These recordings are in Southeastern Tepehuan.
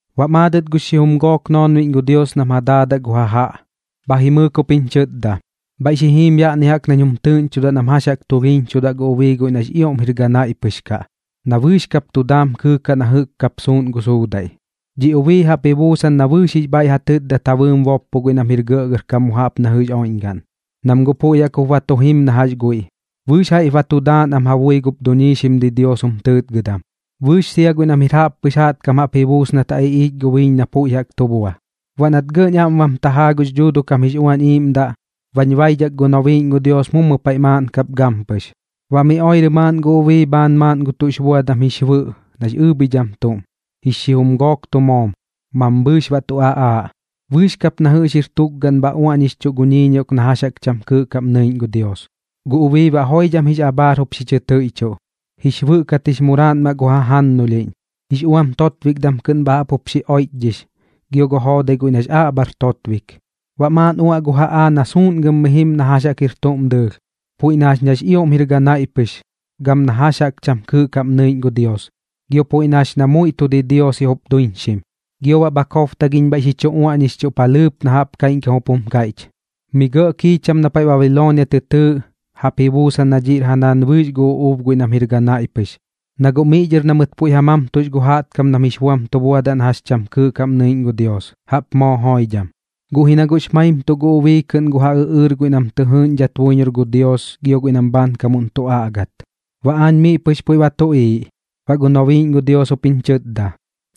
Baꞌ maadɨt gux xijum gook noonbiꞌñ gu Dios nam ja daadaꞌ gu jajaꞌ, bha jimɨɨk jup jiñ chɨtda: ―Bhaiꞌ xi jim yaꞌni jaꞌk nañ jum tɨɨꞌñchudaꞌ nam jax jaꞌk tulhiiñchudaꞌ gu ubii guiꞌ nax ioꞌm jir ganaiꞌ pɨx kaꞌ, na bɨɨx kap tu daam kɨɨkaꞌ na jɨꞌk kap suusuꞌn gu suudaiꞌ. Dhiꞌ dhi ubii jaꞌp ji buusan na bɨɨx jix bhaiꞌ ja tɨtdat ja bɨɨm boppo guiꞌ nam jir gɇꞌgɇrkam mu jaꞌp na jɨꞌx oiꞌñgaꞌn, nam guꞌ puiꞌ jaꞌk jup ba tu jim na jax guiꞌ, bɨɨx jaiꞌp ba tu daan am ja bui gup duñiixim didios jum tɨɨtgɨdam, bɨɨx sia guiꞌ nam jir jaꞌppɨx jaꞌtkam jaꞌp ji buus nat ja iꞌiich gu biiñ na puiꞌ jaꞌk tu bua. Baꞌ nat gɇꞌñ aꞌm bam tajaa gux Dhuuduꞌ kam jix Uañ Iiꞌmdaꞌ, bañ baidhak gu nobiiꞌñ gu Dios mummu paiꞌ maaꞌn kap gampɨx. Baꞌ miꞌ oirɨ maaꞌn gu ubii bhaan gu tuꞌx buadam jix bɨꞌ na ɨɨbhidham tuꞌm, jix xijum gook tu moom, mambhɨɨx baꞌ tu aꞌaaꞌ. Bɨɨx kap na jɨꞌx jir tukgaram bha uaꞌñixchuꞌ gu ñiiñioꞌk na jax jaꞌk cham kɨɨꞌ kaꞌm nɨiꞌñ gu Dios. Gu ubii baꞌ joidham jix abhaar jup xi chɨ tɨiꞌchuꞌ, jix bɨꞌ kat jix muraaꞌnmaꞌ gu jannulhiꞌñ, jix uam totbikdam kɨꞌn bha jaꞌp jup xi oiꞌchdhix gio gu joodai guiꞌ nax aꞌbhar totbik. Baꞌ maaꞌn uaꞌ gu jaꞌaa na suuꞌngɨm mi jim na jax jaꞌk jir tuꞌm dɨɨlh, puiꞌ na jax nax ioꞌm jir ganaiꞌ pɨx gam na jax jaꞌk cham kɨɨꞌ kaꞌm nɨiꞌñ gu Dios, gio puiꞌ na jax na muiꞌ tu didiosiꞌ jup duiñxim. Gio baꞌ bha kobtagiꞌñ bhaiꞌ xi chu uaꞌñixchuꞌ palhɨɨp na jaꞌp kaiꞌñkam jup jum kaiꞌch: “Mi gɇꞌ kiicham na paiꞌ Babiloonia tɨ tɨɨꞌ, jaꞌp ji buusan na dhiꞌr ja naan bɨɨx gu uꞌuub guiꞌ nam jir ganaiꞌ pɨx, na guꞌ miꞌ dhɨr na mɨt puiꞌ ja mamtux gu jaꞌtkam nam jix buam tu buadaꞌ na jax cham kɨɨꞌ kaꞌm nɨiꞌñ gu Dios, jaꞌp moo joidham.” Guꞌ ji na guꞌx maimtuꞌ gu ubii kɨꞌn gu ja ɨꞌɨɨr guiꞌ nam tɨ jɨɨꞌñdhat buiñor gu Dios gio guiꞌ nam bhaankamuꞌn tu aꞌgat. Baꞌ aañ miꞌ pɨx puiꞌ ba tuꞌiiꞌ, baꞌ gu nobiiꞌñ gu Dios jup jiñ chɨtda: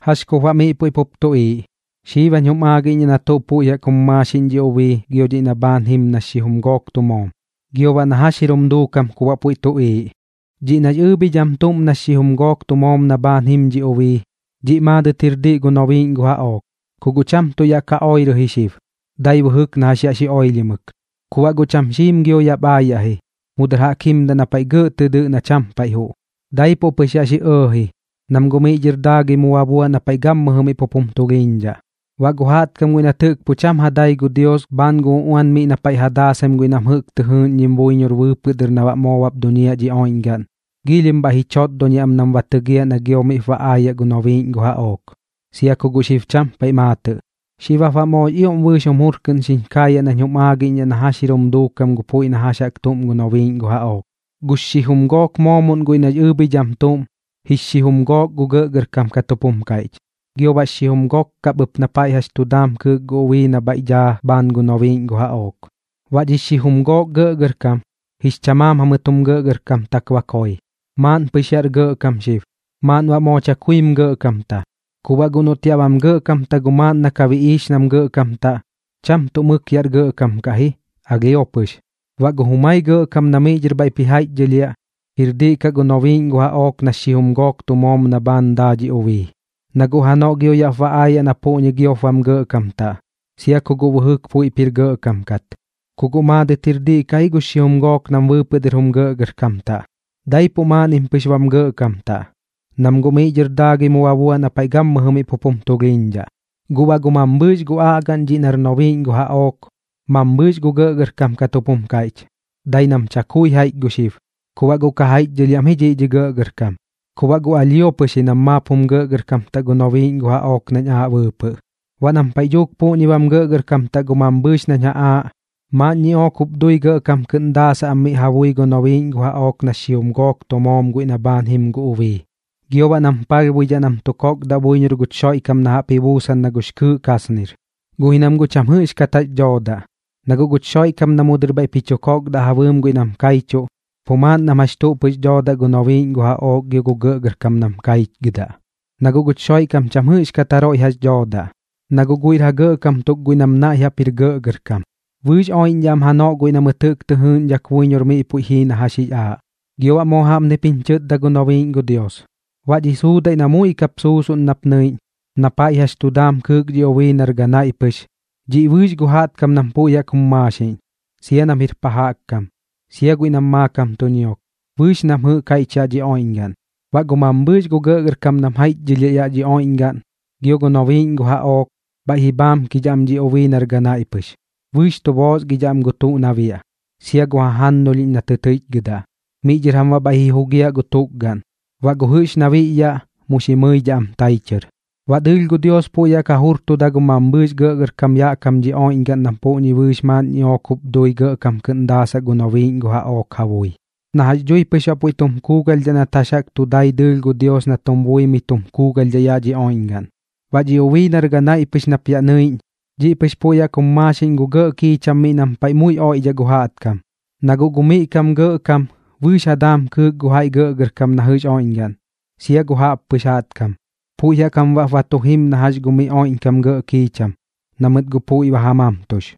―¿Jax kup baꞌ miꞌ puiꞌ pup tuꞌiiꞌ? Xib jañ jum aagiꞌñdhaꞌ na tuꞌ puiꞌ jaꞌk jum maaxiꞌñ dhi ubii gio dhiꞌ na bhaan jim nax xijum gook tu moom, gio baꞌ na jax jir jum duukam kum baꞌ puiꞌ tuꞌiiꞌ. Dhiꞌ nax ɨɨbhidham tuꞌm nax xijum gook tu moom na bhaan jim dhi ubii, dhiꞌ maadɨt jir diꞌ gu nobiiꞌñ gu jaꞌook. Ku guꞌ cham tuꞌ yaꞌ ka oirɨ ji xib, dai bɨjɨk na jax yaꞌ xi oilhimɨk, ku baꞌ guꞌ cham xiim gio yaꞌp aayaꞌ ji, mu dɨr jaꞌk jimdaꞌ na paiꞌ gɇꞌ tɨ dɨꞌ na cham paiꞌ juꞌ. Daipuꞌ pɨx yaꞌ xi ɇɇji, nam guꞌ miꞌ dhɨr daagɨi mu ba buaꞌ na paiꞌ gammɨjɨ miꞌ pup jum tulhiiñdhaꞌ. Baꞌ gu jaꞌtkam guiꞌ nat jɨꞌk pu cham ja dai gu Dios bhaan gu uꞌuan miꞌ na paiꞌ ja daasaim guiꞌ nam jɨꞌk tɨ jɨɨꞌñdhim buiñor bɨɨpɨꞌ dɨr na baꞌ moo bap duñiaꞌ dhi oiꞌñgaꞌn, giilhim bhaiꞌ ji chotdoniaꞌ am nam ba tɨgiaꞌ na gio miꞌp ba aayaꞌ gu nobiiꞌñ gu jaꞌook, sia ku guꞌ xib cham paiꞌ maatɨꞌ. ’Xib jap baꞌ moox ioꞌm bɨɨx jum jur kɨꞌn xiñ kaayaꞌ nañ jum aagiꞌñdhaꞌ na jax jir jum duukam gu puiꞌ na jax jaꞌk tuꞌm gu nobiiꞌñ gu jaꞌook: Gux xijum gook moomoꞌn guiꞌ nax ɨɨbhidham tuꞌm, jix xijum gook gu gɇꞌgɇrkam kat jup jum kaiꞌch, gio baꞌ xijum gok kap ɨp na paiꞌ jax tu daam kɨɨk gu ubii na bhaiꞌ daa bhaan gu nobiiꞌñ gu jaꞌook. Baꞌ dhix xijum gook gɇꞌgɇrkam, jix chamaam jamɨt jum gɇꞌgɇrkamtak ba koi. Maaꞌn pɨx yaꞌr gɇꞌkam xib, maaꞌn baꞌ moo chakuim gɇꞌkamta. Ku baꞌ guꞌ noꞌt yaꞌ bam gɇꞌkamta gu maaꞌn na ka biꞌiix nam gɇꞌkamtaꞌ, cham tuꞌ mɨk yaꞌr gɇꞌkam kaꞌ ji, alhio pɨx. Baꞌ gu jumai gɇꞌkam na miꞌ dhɨr bhaiꞌp ji jaiꞌchdhɨlhiaꞌ, jir diꞌ kaꞌ gu nobiiꞌñ gu jaꞌook nax xijum gook tu moom na bhaan daa dhi ubii, na guꞌ janoꞌ gio yaꞌp ba aayaꞌ na puꞌñi giop bam gɇꞌkamtaꞌ, sia ku guꞌ bɨjɨk puiꞌp jir gɇꞌkam kat. Ku guꞌ maadɨt jir diꞌ kaꞌ ji gux xijum gook nam bɨɨpɨꞌ dɨr jum gɇꞌgɇrkamtaꞌ, daipuꞌ maaꞌnnim pɨx bam gɇꞌkamtaꞌ, nam guꞌ miꞌ dhɨr daagɨi mu ba buaꞌ na paiꞌ gammɨjɨ miꞌ pup jum tulhiiñdhaꞌ. ’Guꞌ baꞌ gu mambhɨɨx gu aꞌgaꞌn dhiꞌ nar nobiiꞌñ gu jaꞌook, mambhɨɨx gu gɇꞌgɇrkam kat jup jum kaiꞌch, dai nam chakui jaiꞌch gu xib. Ku baꞌ guꞌ ka jaiꞌchdhɨlhiaꞌ am ji dhiꞌ dhi gɇꞌgɇrkam, ku baꞌ guꞌ alhio pɨx ji nam maap jum gɇꞌgɇrkamtaꞌ gu nobiiꞌñ gu jaꞌook nañ aaꞌ bɨɨpɨꞌ. Baꞌ nam paiꞌ dhuuk puꞌñi bam gɇꞌgɇrkamtaꞌ gu mambhɨɨx nañ ja aaꞌ, maaꞌn ñiꞌook jup dui gɇꞌkam kɨꞌn daasaꞌ am miꞌ ja bui gu nobiiꞌñ gu jaꞌook nax xijum gook tu moom guiꞌ na bhaan jim gu ubii. Gio baꞌ nam palhbuidhaꞌ na tu kokdaꞌ buiñor guch Xoiꞌkam na jaꞌp ji buusan na gux kɨɨꞌ kasnir. Guꞌ ji nam guꞌ cham jɨꞌxkat jax dhoodaꞌ, na guꞌ guch Xoiꞌkam na mu dɨr bhaiꞌp ji chu kokdaꞌ ja bɨɨm guiꞌ nam kaichuꞌ, pu maaꞌn na jax tuꞌ pɨx doodaꞌ gu nobiiꞌñ gu jaꞌook gio gu gɇꞌgɇrkam nam kaichgɨdaꞌ. Na guꞌ guch Xoiꞌkam cham jɨꞌxdhat jaroiꞌ jax dhoodaꞌ, na guꞌ guiꞌr ja gɇꞌkam tuk guiꞌ nam naiꞌ jaꞌp jir gɇꞌgɇrkam. Bɨɨx oiꞌñdhaꞌ am janoꞌ guiꞌ na mɨt jɨꞌk tɨ jɨɨꞌñdhak buiñor miꞌ puiꞌ jii na jax jix aaꞌ. Gio baꞌ moo jaꞌpnip jiñ chɨtda gu nobiiꞌñ gu Dios: ―Baꞌ dhi suudaiꞌ na muiꞌ kap suusuꞌn nap nɨiꞌñ, na paiꞌ jax tu daam kɨɨk dhi ubii nar ganaiꞌ pɨx, dhiꞌ bɨɨx gu jaꞌtkam nam puiꞌ jaꞌk jum maaxiꞌñ, sia nam jir pa jaꞌk kam, sia guiꞌ nam maakam tu ñiok, bɨɨx nam jɨꞌk jaiꞌch yaꞌ dhi oiꞌñgaꞌn. Baꞌ gu mambhɨɨx gu gɇꞌgɇrkam nam jaiꞌchdhɨlhiaꞌ yaꞌ dhi oiꞌñgaꞌn, gio gu nobiiꞌñ gu jaꞌook, bhaiꞌ ji bhaamkidhaꞌ am dhi ubii nar ganaiꞌ pɨx. Bɨɨx tu boosgidhaꞌ am gu tuꞌ na biaꞌ, sia gu jajannulhiꞌñ na tɨ tɨiꞌchgɨdaꞌ. Miꞌ dhɨr jam baꞌ bhaiꞌ ji jugiaꞌ gu tukgaꞌn, baꞌ gu jɨꞌx na biꞌyaꞌ, mu xi mɨidhaꞌ am tai chɨr. Baꞌ dɨɨlh gu Dios puiꞌ jaꞌk ja jurtuda gu mambhɨɨx gɇꞌgɇrkam yaꞌ kam dhi oiꞌñgaꞌn nam puꞌñi bɨɨx dhɨt maaꞌn ñiꞌook jup dui gɇꞌkam kɨꞌn daasaꞌ gu nobiiꞌñ gu jaꞌook ja bui, na jax dhui pɨx baꞌ guiꞌ puiꞌ tu kuugalhdhaꞌ nat jax jaꞌk tu dai dɨɨlh gu Dios na tum buimɨi tum kuugalhdhaꞌ yaꞌ dhi oiꞌñgaꞌn. Baꞌ dhi ubii nar ganaiꞌ pɨx nap yaꞌ nɨiꞌñ, dhiꞌ pɨx puiꞌ jaꞌk jum maaxiꞌñ gu gɇꞌ kiicham miꞌ nam paiꞌ muiꞌ oiꞌdhaꞌ gu jaꞌtkam, na guꞌ gu miꞌ kam gu gɇꞌkam, bɨɨx ja daam kɨɨk gu jaiꞌ gɇꞌgɇrkam na jɨꞌx oiꞌñgaꞌn, sia gu jaꞌppɨx jaꞌtkam. Puiꞌ jaꞌk jam baꞌp ba tu jim na jax gu miꞌ oiꞌñkam gɇꞌ kiicham, na mɨt guꞌ puiꞌ ba ja mamtux.